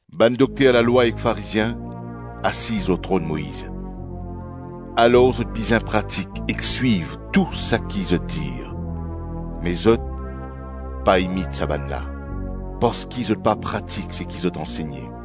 “Bann dokter lalwa ek Farizien, asiz lor tronn Moiz; alor zot bizin pratik ek swiv tou saki zot dir; me zot, pa imit sa bann la, parski zot pa pratik seki zot ansegne.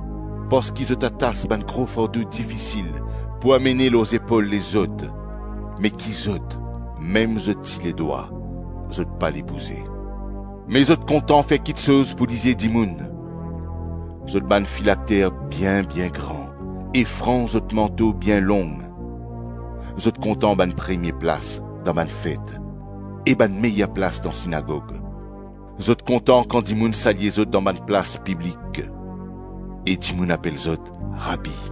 Parski zot atas bann gro fardo difisil pou amene lor zepol lezot, me ki zot, mem zot ti ledwa, zot pale bouze. Me zot kontan fer kiksoz pou lizie dimoun, zot bann filakter bien-bien gran e franz zot manto bien long. Zot kontan bann premie plas dan bann fet e bann meyer plas dan sinagog. Zot kontan kan dimoun salye zot dan bann plas piblik e dimoun apel zot Rabi.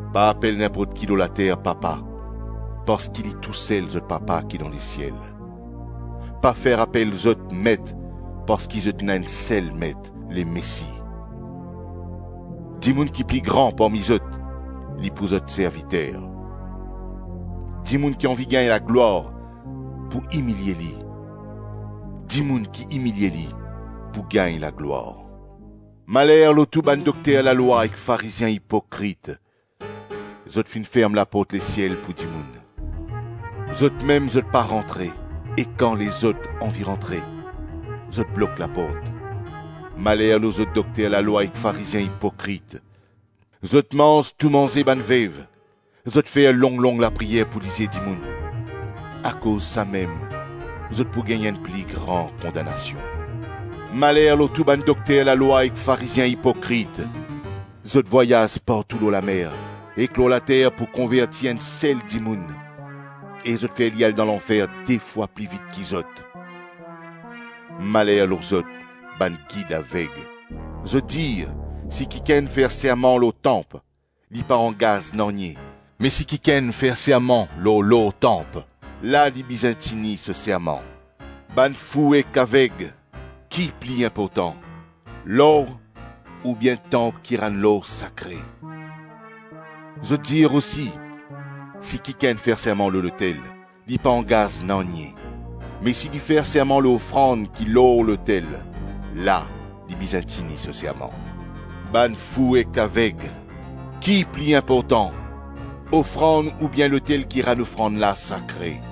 Pa apel ninport ki lor later papa, parski Li tousel zot papa ki dan lesiel. Pa fer apel zot met parski zot ena enn sel met, Lemesi. Dimoun ki pli gran parmi zot, li pou zot serviter. Dimoun ki anvi gagn laglwar pou imilie li, dimoun ki imilie li pou gagn laglwar. Maler lor tou bann dokter lalwa ek Farizien ipokrit! Zot finn ferm laport lesiel pou dimoun. Zotmem zot pa rantre e kan lezot anvi rantre, zot blok laport. Maler lor zot dokter lalwa ek Farizien ipokrit, zot manz tou manze bann vev, zot fer long-long lapriyer pou lizie dimoun. Akoz samem zot pou gagn enn pli gran kondanasion. Maler lor tou bann dokter lalwa ek Farizien ipokrit. Zot vwayaz partou lor lamer ek lor later pou konverti enn sel dimoun e zot fer li al dan lanfer de fwa pli vit ki zot. Maler lor zot, bann gid aveg. Zot dir, ‘Si kikenn fer serman lor tanp, li pa angaz nanye; me si kikenn fer serman lor tanp, la li bizin tini so serman.’ Bann fou ek aveg! Ki pli inportan? Lor oubien tanp ki rann lor la sakre? Zot dir osi: ‘Si kikenn fer serman lor lotel, li pa angaz nanye; me si li fer serman lor ofrand ki lor lotel, la li bizin tini so serman.’ Bann fou ek aveg! Ki pli inportan? Ofrand oubien lotel ki rann ofrand la sakre?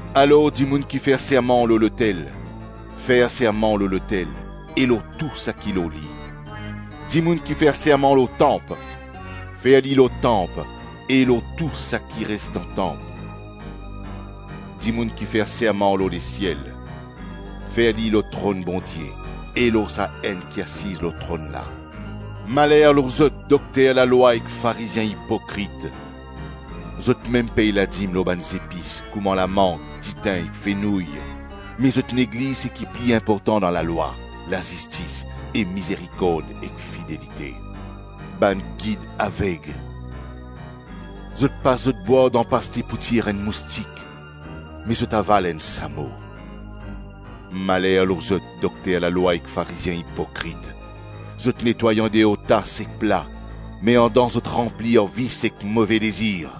Alor dimoun kifer serman lor lotel, fer serman lor lotel e lor tou saki lor li. Dimoun kifer serman lor tanp, fer li lor tanp e lor tou saki res dan tanp. Dimoun ki fer serman lor lesiel, fer li lor tronn Bondie e lor sa Enn ki asiz lor tronn la. Maler lor zot, dokter lalwa ek Farizien ipokrit. Zotmem pey ladim lor bann zepis kouma lamant, ditin ek fenouy, me zot negliz seki pli inportan dan lalwa, lazistis e mizerikord ek fidelite. Bann gid aveg! Zot pas zot bwar dan paste pou tir enn moustik, me zot aval enn samo. Maler lor zot, dokter lalwa ek Farizien ipokrit! Zot netway andeor tas ek pla, me andan zot ranpli ar vis ek move dezir.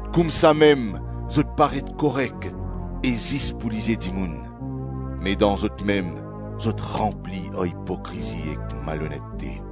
Koumsamem zot paret korek e zis pou lizie dimoun, me dan zotmem zot ranpli ar ipokrizi ek malonete.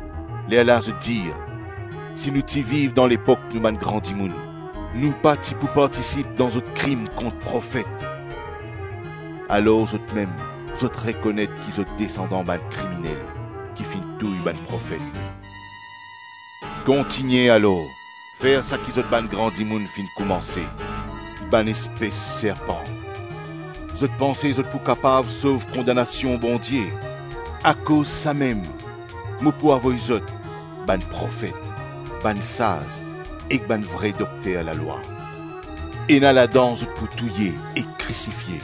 lerla zot dir: ‘Si nou ti viv dan lepok nou bann gran dimoun, nou pa ti pou partisip dan zot krim kont profet.’ Alor zotmem, zot rekonet ki zot desandan bann kriminel ki finn touy bann profet. Kontigne alor, fer saki zot bann gran dimoun finn koumanse. Bann espes serpan! Zot panse zot pou kapav sov kondanasion Bondie? Akoz samem, mo pou avoy zot bann profet, bann saz ek bann vre dokter lalwa. Ena ladan zot pou touye ek krisifie,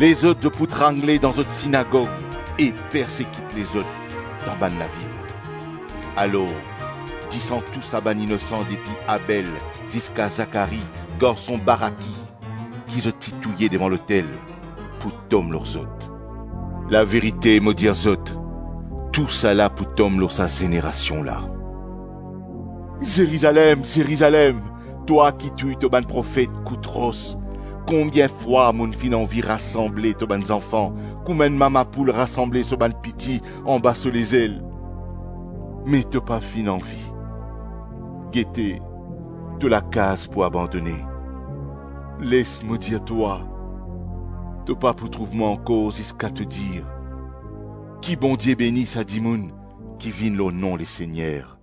lezot zot pou trangle dan zot sinagog ek persekit lezot dan bann lavil. Alor, disan tou sa bann inosan depi Abel ziska Zakari garson Baraki ki zot ti touye devan lotel, pou tom lor zot. Laverite, mo dir zot, tousala pou tom lor sa zenerasion la.” “Zerizalem, Zerizalem, twa ki touy to bann profet kout ros! Konbien fwa mo finn anvi rasanble to bann zanfan kouma enn mama poul rasanble so bann piti anba so lezel, me to pa finn anvi! Gete, to lakaz pou abandone. Les mo dir twa, to pa pou trouv mwa ankor ziska to dir, ‘Ki Bondie beni sa dimoun ki vinn lor nom Lesegner.’”